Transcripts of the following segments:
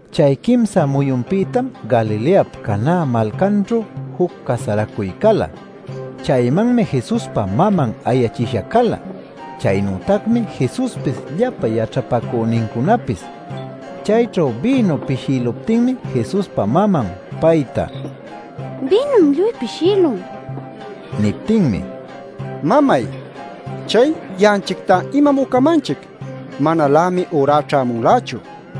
Chay quimsa muyunpïtam Galileap Caná malcanćhu juc casaracuy cala. Chaymanmi Jesuspa maman ayachisha cala. Chaynütacmi Jesuspis llapa yaćhapacünincunapis. Chayćhu bïnu pishïluptinmi Jesuspa maman payta: “Bïnum lluy pishïlun” nin. Niptinmi: “Mamay chay ya'anchictá ¿imam ucamanchic? Manalämi ürá ćhämunlächu” nin.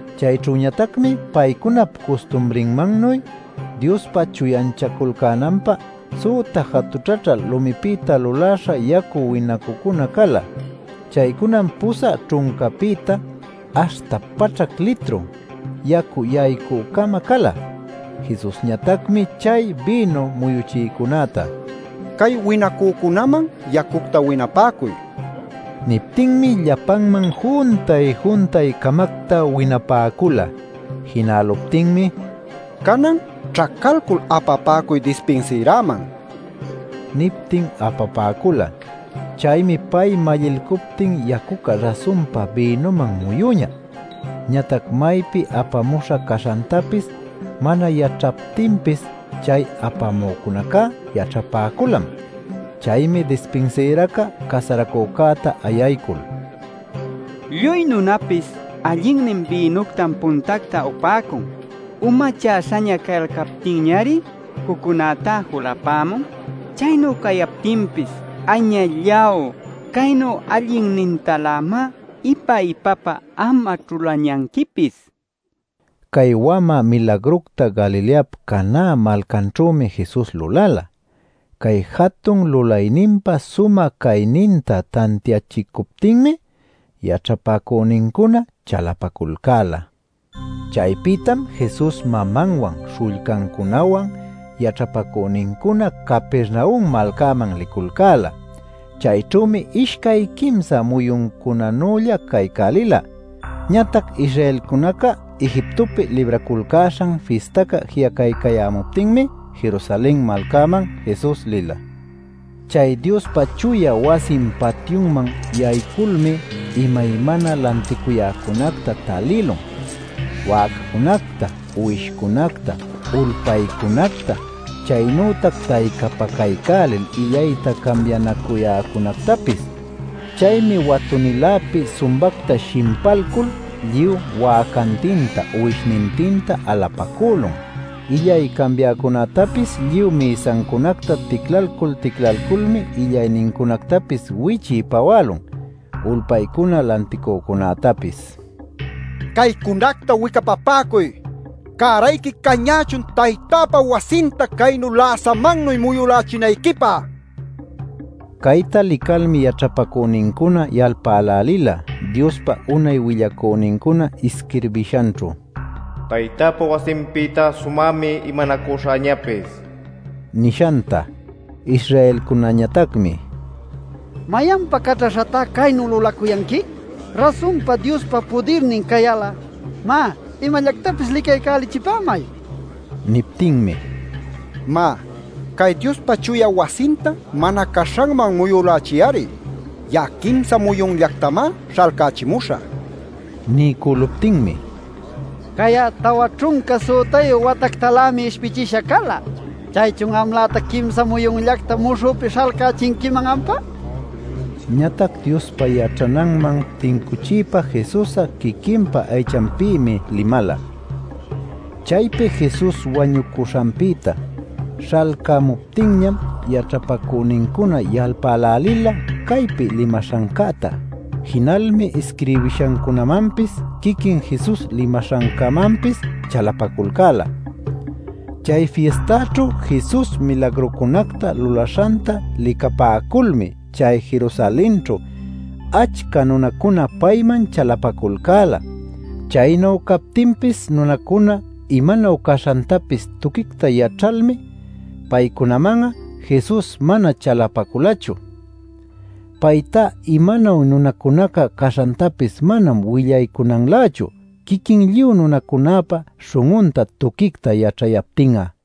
Chayćhüñatacmi paycunap custumrinmannuy Diospa chuyanchaculcänanpä süta jatućhaćhä lumipïta luläśha yacu winacucuna cala. (Chaycunam pusä ćhuncapïta aśhta paćhac litru yacu yaycü-cama cala.) Jesusñatacmi chay bïnu muyuchïcunäta: “Cay winacücunaman yacucta winapäcuy” nila. Niptinmi llapanman juntay-juntay-camacta winapäcula. Jinäluptinmi: “Canan ćhacalcul apapäcuy dispinsïräman” niptin apapäcula. Chaymi pay mallilcuptin ¡yacuca rasunpa bïnüman muyüñä! Ñatac maypi apamuśha caśhantapis mana yaćhayaptinpis chay apamücunacá yaćhapäculam. Chaymi dispinsïraca casaracücäta ayaycul: “Lluy nunapis allinnin bïnuctam puntacta upäcun; umachäśhaña cayalcaptinñari juccunäta julapämun. Chaynu cayaptinpis ¡añalláw, caynu allinnintalämá ipa-ipapa am'a ćhulañanquipis!” nin. Cay wamä milagructa Galileap Caná malcanćhümi Jesus lulala. Cay jatun lulayninpa sumä cayninta tantiachicuptinmi, yaćhapacünincuna chalapaculcäla. Chaypïtam Jesus, mamanwan, śhullcancunawan, yaćhapacünincuna Capernaum malcaman liculcäla. Chayćhümi ishcay quimsa muyuncunanülla caycälila. Ñatac Israelcunaca Egiptopi Libraculcäśhan Fistaca ji'acaycayämuptinmi Jerusalen malcaman Jesus lila. Chay Diospa chuya wasin patyunman yayculmi imaymana lanticuyäcunacta talïlun: wäcacunacta, uwishcunacta, ulpaycunacta, chaynütac taycapacaycälil illayta cambianacuyäcunactapis. Chaymi watu-niläpi sumbacta shimpalcul, lluy wäcantinta, uwishnintinta alapacülun. Illay cambiäcunätapis lluy mïsancunacta ticlalcul ticlaculmi illaynincunactapis wichiy-pawälun. Ulpaycuna lanticücunätapis: “¡Caycunacta wicapapäcuy! ¡Cärayqui cañächun taytäpa wasinta caynu läsamannuy muyulächinayquipä!” nin. Cayta licalmi yaćhapacünincuna yalpälälila Diospa unay willacünincuna isquirbishanćhu: “Taytäpa wasinpïta sumämi imanacuśhäñapis” nishanta. Israelcunañatacmi: “¿Mayanpa caćhaśhatá caynu lulacuyanqui? Rasunpa Diospa pudirnin cayal'a, má, imallactapis licaycälichipämay” nipäcun. Niptinmi: “Má, cay Diospa chuya wasinta mana caśhanman muyülächiy-ari. Ya'a quimsa muyunllactamá śhalcachimuśhä” nin. Niycüluptinmi: “Cay'a tawa ćhunca sütayu watactalämi ishpichisha cala. ¿Chaychun amlätac quimsa muyunllacta muśhüpi śhalcächinquiman ampá?” nicuyalcan. Ñatac Diospa yaćhananman tincuchiypa Jesus'a quiquinpa aychanpïmi limala. Chaypi Jesus wañucuśhanpïta śhalcämuptinñam yaćhapacünincuna yalpälälila caypi limaśhancäta. Jinalmi isquirbishancunämanpis quiquin Jesus limaśhancämanpis chalapaculcäla. Chay fistaćhu Jesus milagrucunacta lulaśhanta licapäculmi chay Jerusalenćhu achca nunacuna payman chalapaculcäla. Chaynu captinpis nunacuna imanuy caśhantapis tuquicta yaćhalmi paycunaman'a Jesus mana chalapaculachu. Paytá imanuy nunacunaca caśhantapis manam willaycunanlächu quiquin lluy nunacunäpa śhun'unta tuquicta yaćhayaptin'a.